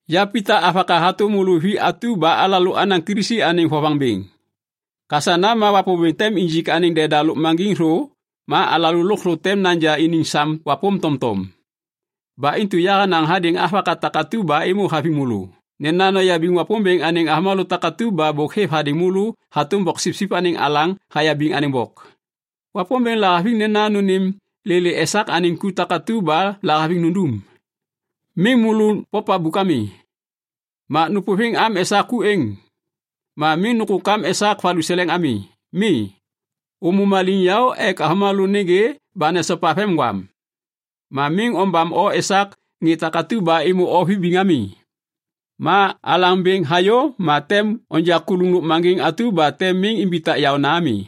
Ya Pita avaka hatôm môlô vi atu ba alalô anaŋ Kilisi anêŋ vovaŋ bêŋ. Kasana ma Wapômbêŋ tem injik anêŋ deda lôkmaŋgiŋ thô ma alalô lôkthô tem naja iniŋ sam wapôm tomtom. Ba intu yahanaŋ hadêŋ avaka takatu ba êmô haviŋ môlô nena noyabiŋ Wapômbêŋ anêŋ avômalô takatu ba bôk êv hadêŋ môlô hatôm boksipsip anêŋ alaŋ hayabiŋ anêŋ bok. Wapômbêŋ lahaviŋ nena nônêm lêlê esak anêŋ ku takatu ba lahaviŋ nundum. Miŋ môlô popabuk ami. Ma nôpôviŋ am esak ku êŋ. Ma miŋ nôkôkam esak valuseleŋ ami. Mi. Ômô maliŋyaô ek avômalô nêgê ba nesopa vemgwam. Ma miŋ ombam o esak ŋê atu ba êmô o vibiŋ ami. Ma Alaŋ Bêŋ hayô ma tem onja kuluŋ lôkmaŋgiŋ atu ba tem miŋ imbitak yaôna ami.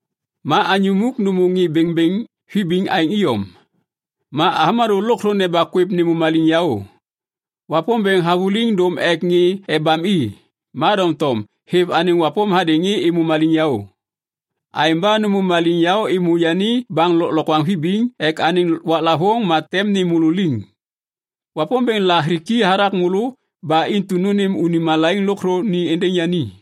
Ma anyô muk nômô ŋê bêŋbêŋ vibiŋ aêŋ iyom. Ma avômalô lôkthô neba kwêv nêmô maliŋyaô. “Wapômbêŋ havôliŋ dôm ek ŋê ebam i, ma doŋtom hêv anêŋ wapôm hadêŋ ŋê êmô maliŋyaô.” Aêŋ ba nômô maliŋyaô êmô yani baŋ lôklokwaŋ vibiŋ ek anêŋ waklavôŋ ma tem nêm môlô liŋ. Wapômbêŋ lahiki hathak môlô ba intu nônêm unim malaiŋ lôkthô ni êndêŋ yani.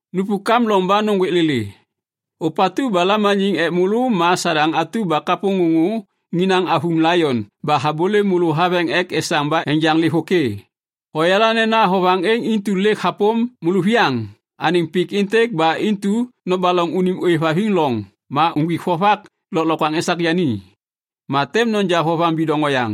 Nupuk am loŋ ba nôŋgwêk lêlê. Ôpatu ba lamaniŋ ek môlô ma Sadaŋ atu ba kapôŋôŋô inaŋ avuŋ laion ba habôlêm môlô haveŋ ek esaŋ ba enjaŋ lêvôkê. Hoyala nena vovaŋ êŋ intu lêk hapôm môlôviyaŋ anêŋ pik êntêk ba intu nobaloŋ unim ôêvhaviŋ loŋ ma uŋgwik vovak lôklokwaŋ esak yani. Ma tem noja vovaŋ bidoŋ oyaŋ.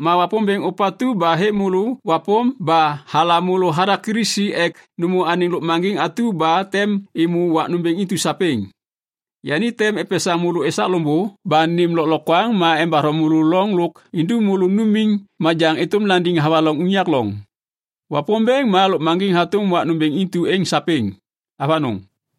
Ma Wapômbêŋ ôpatu ba hêv môlô wapôm ba halam môlô hathak Kilisi ek nômô anêŋ lôkmaŋgiŋ atu ba tem êmô wak nômbêŋ intu sapêŋ, yani tem epesaŋ môlô esak loŋbô ba nêm lôklokwaŋ ma embatho môlô loŋ lôk indum môlô numiŋ majaŋ êtôm landiŋ havaloŋ unyak loŋ. Wapômbêŋ ma lôkmaŋgiŋ hatôm wak nômbêŋ intu êŋ sapêŋ. Avanôŋ.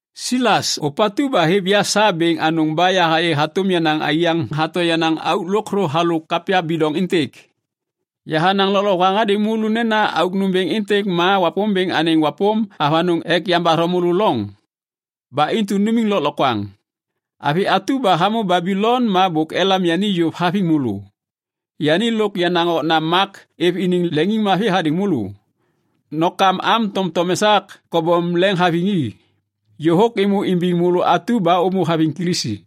Silas, ôpatu ba hêv ya sa bêŋ anôŋ ba yahayê hatôm yenaŋ aiyaŋ hato yenaŋ auk lôkthô halôk kapya bidoŋ êntêk. Yahanaŋ lôklokwaŋ hadêŋ môlô nena auk nômbêŋ êntêk ma Wapômbêŋ anêŋ wapôm avanôŋ ek yambatho môlô loŋ. Ba intu numiŋ lôklokwaŋ. Avi atu ba hamô Babilon ma bôk elam yani yôv haviŋ môlô, yani lôk yenaŋ okna Mak êv iniŋ leŋiŋmavi hadêŋ môlô. Nokam am tomtom esak kobom leŋhaviŋ i. Yôhôk êmô imbiŋ môlô atu ba ômô haviŋ Kilisi.